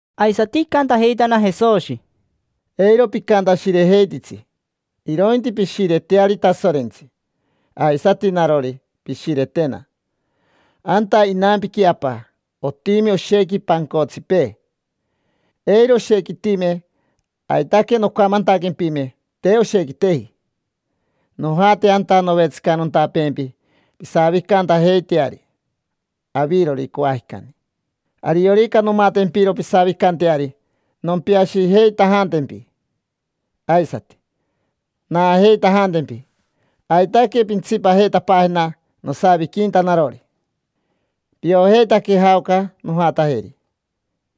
Aisati icantajeitana Jesoshi: —Eiro picantashirejeititsi, irointi pishireteari Tasorentsi. Aisati narori, pishiretena. Anta inampiqui Apa otimi oshequi pancotsipee. Eiro oshequitime, aitaque noncamantaquempime te oshequiteji. Nojate anta novetsicanontapeempi pisavicantajeiteari avirori coajicani. Ariorica nomatempiro pisavicanteari, nompiashijeitajantempi aisati, naajeitajantempi. Aitaque pintsipajeitapaajena nosaviquinta narori. Piojeitaque jaoca nojatajeri.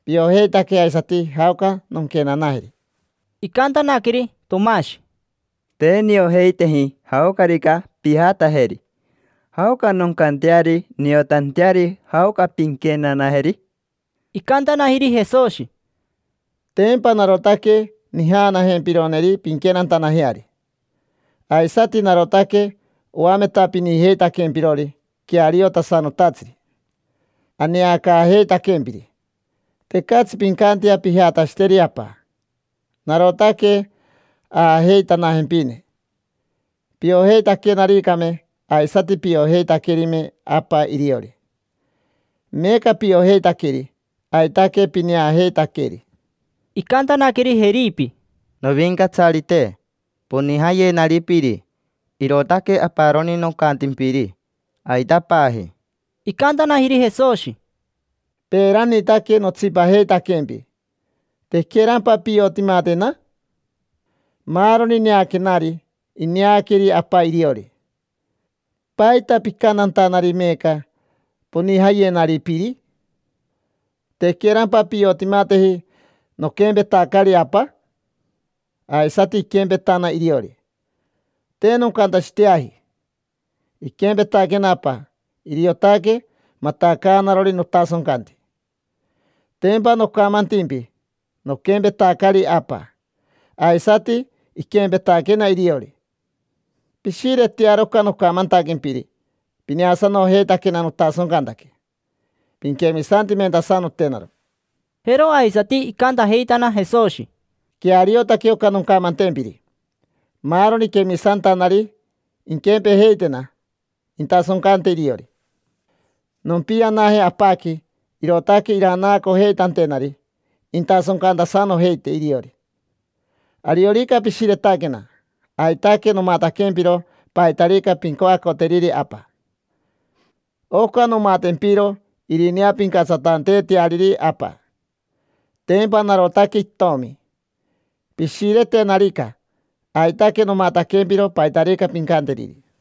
Piojeitaque aisati jaoca nonquenanajeri. Icantanaqueri Tomashi: —Te niojeiteji jaocarica pijatajeri. ¿Jaoca noncanteari niotanteari jaoca pinquenanajeri? Icantanajiri Jesoshi: —Tempa narotaque nijaanajempironeri pinquenantanajeari, aisati narotaque oametapinijeitaquempirori queariotasanotatsiri, aneacaajeitaquempiri. Tecatsi pincantea pijatashiteri Apa, narotaque aajeitanajempine. Piojeitaquenaricame, aisati piojeitaquerime Apa iriori. Meeca piojeitaqueri. Aitaque pineajeitaqueri. Icantanaqueri Jeripi: —Novincatsarite, ponijayenari piri; irootaque aparoni nocantimpiri, aitapaji. Icantanajiri Jesoshi: —Peeranitaque notsipajeitaquempi. ¿Tequerampa piotimatena? Maaroni neaquenari, ineaqueri Apa iriori. ¿Paita picantantanari meeca: “Ponijayenari piri”? ¿Tequerampa piotimateji noquempetacari Apa? Aisati iquempetana iriori. Te noncantashiteaji. Iquempetaquena Apa, iriotaque matacaanarori notasoncanti. Tempa nocamantimpi noquempetacari Apa. Aisati iquempetaquena iriori. Pishiretearo oca nocamantaquempiri. Pineasanojeitaquena notasoncantaque, pinquemisantimentasanotenaro. Jero aisati icantajeitana Jesoshi: —Queariotaque oca noncamantempiri. Maaroni quemisantanari inquempejeitena, intasoncante iriori. Nompianaje Apaqui, irootaque iranaacojeitantenari intasoncantasanojeite iriori. Ariorica pishiretaquena, aitaque nomataquempiro paitarica pincoacoteriri Apa. Oca nomatempiro irineapincatsatanteeteariri Apa. Tempa narotaque Itomi. Pishiretenarica, aitaque nomataquempiro paitarica pincanteriri.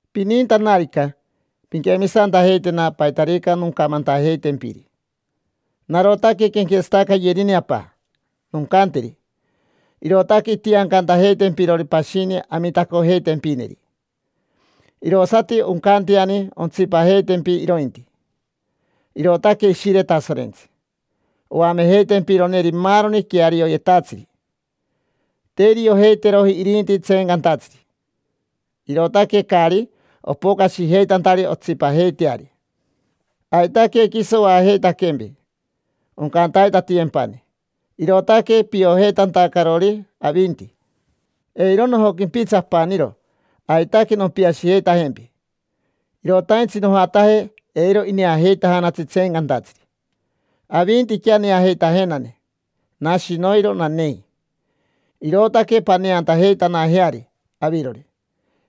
Pinintanarica, pinquemisantajeitena paitarica noncamantajeitempiri. Narotaque quenquetsatacayerine Apa. Noncanteri, irootaque intiancantajeitempirori pashini Amitacotajempineri. Irosati oncanteani ontsipajeitempi irointi: irootaque Ishire Tasorentsi, oamejeitempironeri maaroni quearioyetatsiri. Te iriojeiteroji irinti tseencantatsiri, irootaque caari opocashijeitantari ontsipajeiteari. Aitaque quiso oajeitaquempi, oncantaitatiyempani. Irootaque piojeitantacarori avinti. Eiro nojoquimpitsi apaniro, aitaque nompiashijeitajempi. Irotaintsi nojataje. Eiro ineajeitajanatsi tseencantatsiri, avintiquea neajeitajenane. Nashi noiro nanei, irootaque paneantajeitanajeari avirori: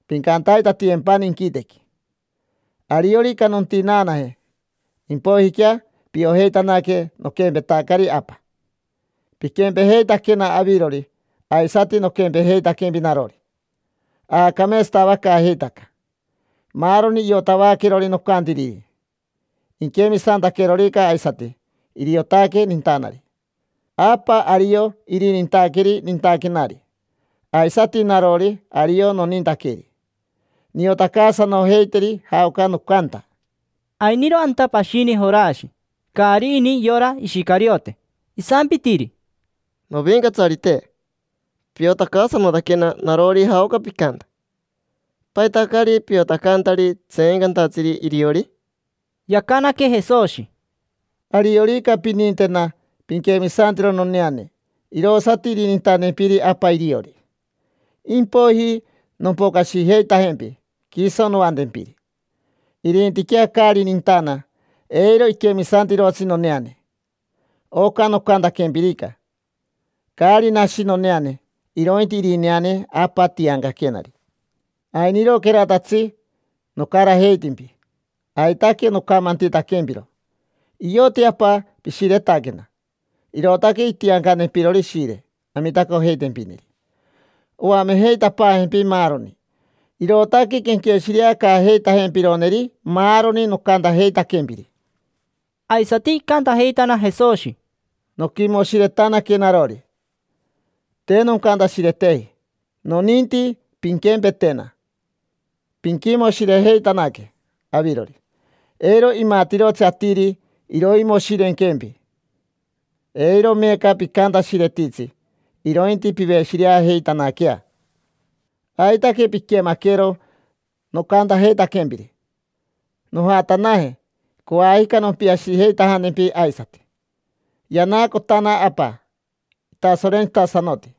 pincantaitatiyempani inquitequi. Ariorica nontinaanaje, impoijiquea piojeitanaque noquempetacari Apa. Piquempejeitaquena avirori, aisati noquempejeitaquempi narori: aacameetsatavacaajeitaca. Maaroni iotavaquerori nocantiriri, inquemisantaquerorica aisati, iriotaque nintanari. Apa ario irinintaqueri nintaquenari. Aisati narori ario nonintaqueri. Niotacaasanojeiteri jaoca nocanta. Ainiro anta pashini Jorashi, caari ini yora Ishicariote. Isampitiri: —Novincatsarite, piotacaasanotaquena narori jaoca picanta. ¿Paita caari piotacantari tseencantatsiri iriori? Yacanaque Jesoshi: —Ariorica pinintena, pinquemisantero noneane, irosati irinintantempiri Apa iriori. Impoiji nompocashijeitajempi quiso noantempiri. Irintiquea caari nintana, eiro iquemisantirotsi noneane. Oca nocantaquempirica, caari nashi noneane, irointi irineane Apa tiancaquenari. Ainiroqueratatsi nocarajeitimpi, aitaque nocamantitaquempiro. Ioti Apa pishiretaquena, irootaque intiancantempirori Ishire, Amitacojeitajempineri. Oamejeitapaajempi maaroni. Irootaque quenqueshireacaajeitajempironeri maaroni nocantajeitaquempiri. Aisati icantajeitana Jesoshi: —Noquimoshiretanaque narori, te noncantashireteji. Noninti pinquempetena, pinquimoshirejeitanaque avirori. Eiro imatirotsi atiri iroimoshirenquempi. Eiro meeca picantashiretitsi, irointi piveshireajeitanaquea. Aitaque piquemaquero nocantajeitaquempiri. Nojatanaje, coajica nompiashijeitajantempi aisati. Yanaacotana Apa itasorentsitasanoti.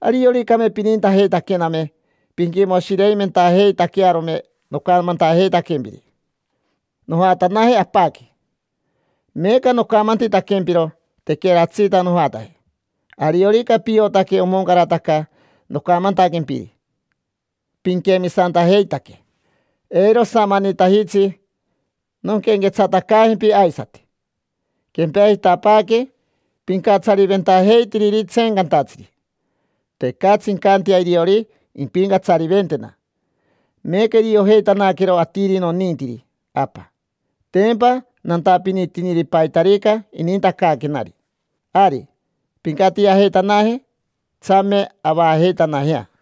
Arioricame pinintajeitaquename pinquimoshireimentajeitaquearome nocamantaquempiri: “Nojatanaje Apaqui”. Meeca nocamantitaquempiro tequeratsita nojataje. Ariorica piotaque omoncarataca nocamantaquempiri, pinquemisantajeitaque. Eiro osamanitajitsi nonquenquetsatacaajempi aisati. Quempejitapaaque pincatsariventajeitiriri tseencantatsiri. Tecatsi incantea iriori impincatsariventena. Meeca iriojeitanaquero atiri nonintiri Apa, tempa nantapinitiniri paitarica inintacaaquenari. Ari, pincatiajeitanaje. Tsame avaajeitanajea.